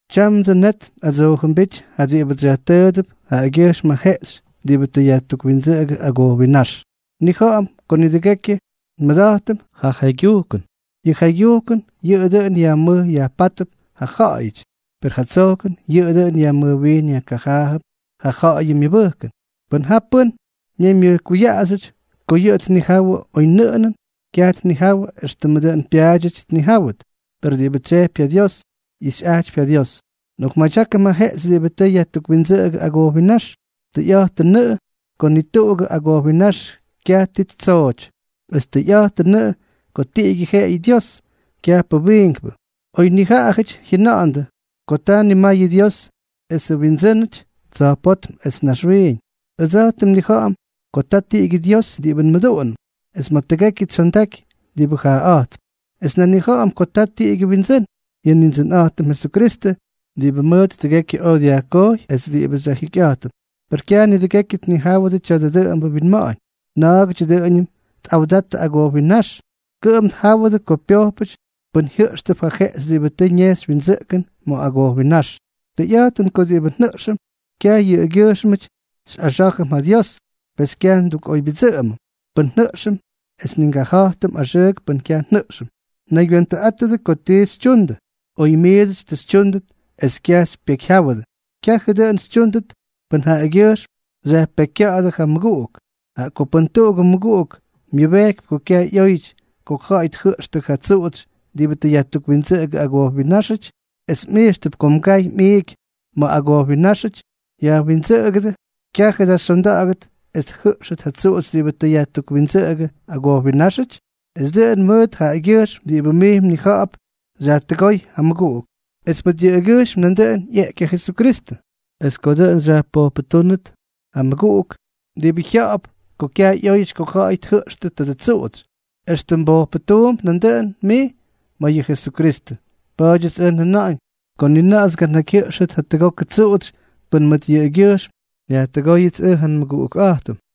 Tyamdsʉ net nꞌadsoojʉmbíty ja diꞌibʉts xyajtʉʉdʉp yʉꞌʉgyʉjxm ja jeꞌxy diꞌibʉ tʉ yajtukwindsʉꞌʉgʉ agojwinnáx. Nnija̱ꞌa̱m ko nidʉgekyʉ nmʉda̱jtʉm ja jaygyujkʉn. Yʉ jaygyujkʉn yʉꞌʉ dʉꞌʉn yajmʉj yajpátʉp ja ja̱ꞌa̱yʉty, per ja tsojkʉn yʉꞌʉ dʉꞌʉn yajmʉjwiin yajkajaajʉp ja ja̱ꞌa̱yʉ myʉbʉjkʉn. Pʉn ja pʉ́n ñaymyʉjkuyaꞌaxyʉty ko yʉꞌʉ tnijawʉ oynʉꞌʉnʉn, kyaj tnijawʉ éxtʉm dʉn pyaadyʉty tnijáwʉt. Per diꞌibʉ tsyejpy ja Dios, ixyꞌa̱jtʉp ja Dios. Nꞌokmadyákʉm ja jeꞌxy diꞌibʉ tʉ yajtukwindsʉꞌʉgʉ agojwinnáx. Tʉyꞌa̱jtʉnʉꞌʉ ko ni tuꞌugʉ agojwinnáx kyaj ti ttsooty, es tʉyꞌa̱jtʉnʉꞌʉ ko tiꞌigyʉ jeꞌeyʉ Dios, kyajpʉ wiinkpʉ. Oy nijaꞌajʉty jyʉna̱ꞌa̱ndʉ ko ta nimayʉ dios esʉ windsʉ́nʉty tsa̱jpótm es naxwiiñ, ʉdsa̱jtʉm nnija̱ꞌa̱m ko ta tiꞌigyʉ Dios diꞌibʉ nmʉduꞌunʉm es ma̱ tʉgekyʉ tsyondaky diꞌibʉ jaaꞌa̱jtp; es nan nnija̱ꞌa̱m ko ta tiꞌigyʉ Windsʉ́n, yʉ Nindsʉnꞌa̱jtʉm Jesukristʉ diꞌibʉ mʉt tʉgekyʉ oj yajkojy es diꞌibʉ xyajjikyꞌa̱jtʉm. Per kyaj nidʉgekyʉ tnijáwʉdʉ tya̱dʉ dʉꞌʉmbʉ winma̱ꞌa̱ñ. Na̱a̱gʉty dʉꞌʉñʉm tꞌawda̱jttʉ agojwinnáx, kʉꞌʉm tjáwʉdʉ ko pyojpʉty pʉn jyʉꞌxtʉp ja jeꞌxy diꞌibʉ tʉ ñejxy windsʉꞌkʉn ma̱ agojwinnáx. Tʉyꞌa̱jtʉn ko diꞌibʉ njʉꞌxʉm, kyaj yʉꞌʉgyʉjxmʉty xyꞌaxá̱jʉm ja Dios; pes kyaj ndukꞌoybyʉdsʉꞌʉmʉm pʉn njʉꞌxʉm es ni ngaja̱jtʉm axʉʉk pʉn kyaj njʉꞌxʉm. Naygywentʉꞌátʉdʉ ko ti xytyundʉ. Oy miidsʉty ti xytyúndʉt es kyaj xypyekyjyáwʉdʉ, kyajʉ dʉꞌʉn xytyúndʉt pʉn jaꞌagyʉjxm xyajpekykya̱ꞌa̱dʉ ja mmʉguꞌuk. Jaꞌa ko pʉn tuꞌugʉ mmʉguꞌuk myʉbejkypy ko kyaj ꞌyóyʉty ko ja̱ꞌa̱y tjʉꞌxtʉ ja tsuꞌutsy diꞌibʉ tʉ yajtukwindsʉꞌʉgʉdʉ agojwinnáxʉty, es mꞌijxʉp ko mgay mꞌiiky ma̱ agojwinnáxʉty yajwindsʉꞌʉgʉdʉ, ¿kyajʉ da xyonda̱ꞌa̱gʉt es tjʉꞌxtʉt ja tsuꞌutsy diꞌibʉ tʉ yajtukwindsʉꞌʉgʉdʉ agojwinnáxʉty? Es dʉꞌʉn mʉt jaꞌagyʉjxm diꞌibʉ mij mnija̱ꞌa̱p xyajtʉgóy ja mmʉguꞌuk, es mʉt yʉꞌʉgyʉjxm nandʉꞌʉn ꞌyeꞌky ja Jesukristʉ. Es ko dʉꞌʉn xyajpojpʉtúnʉt ja mmʉguꞌuk diꞌibʉ jya̱ꞌa̱p ko kyaj ꞌyóyʉty ko ja̱ꞌa̱y tjʉꞌxtʉ tadʉ tsuꞌutsy, extʉ mbojpʉtuump nandʉꞌʉn mij ma̱ yʉ Jesukristʉ. Pa̱a̱dyʉts ʉj njʉna̱ꞌa̱ñ ko ni na̱ꞌa̱ts nganakyjyʉꞌxʉt jatʉgokʉ tsuꞌutsy pʉn mʉt yʉꞌʉgyʉjxm nyajtʉgóyʉts ʉj ja nmʉguꞌukꞌa̱jtʉm.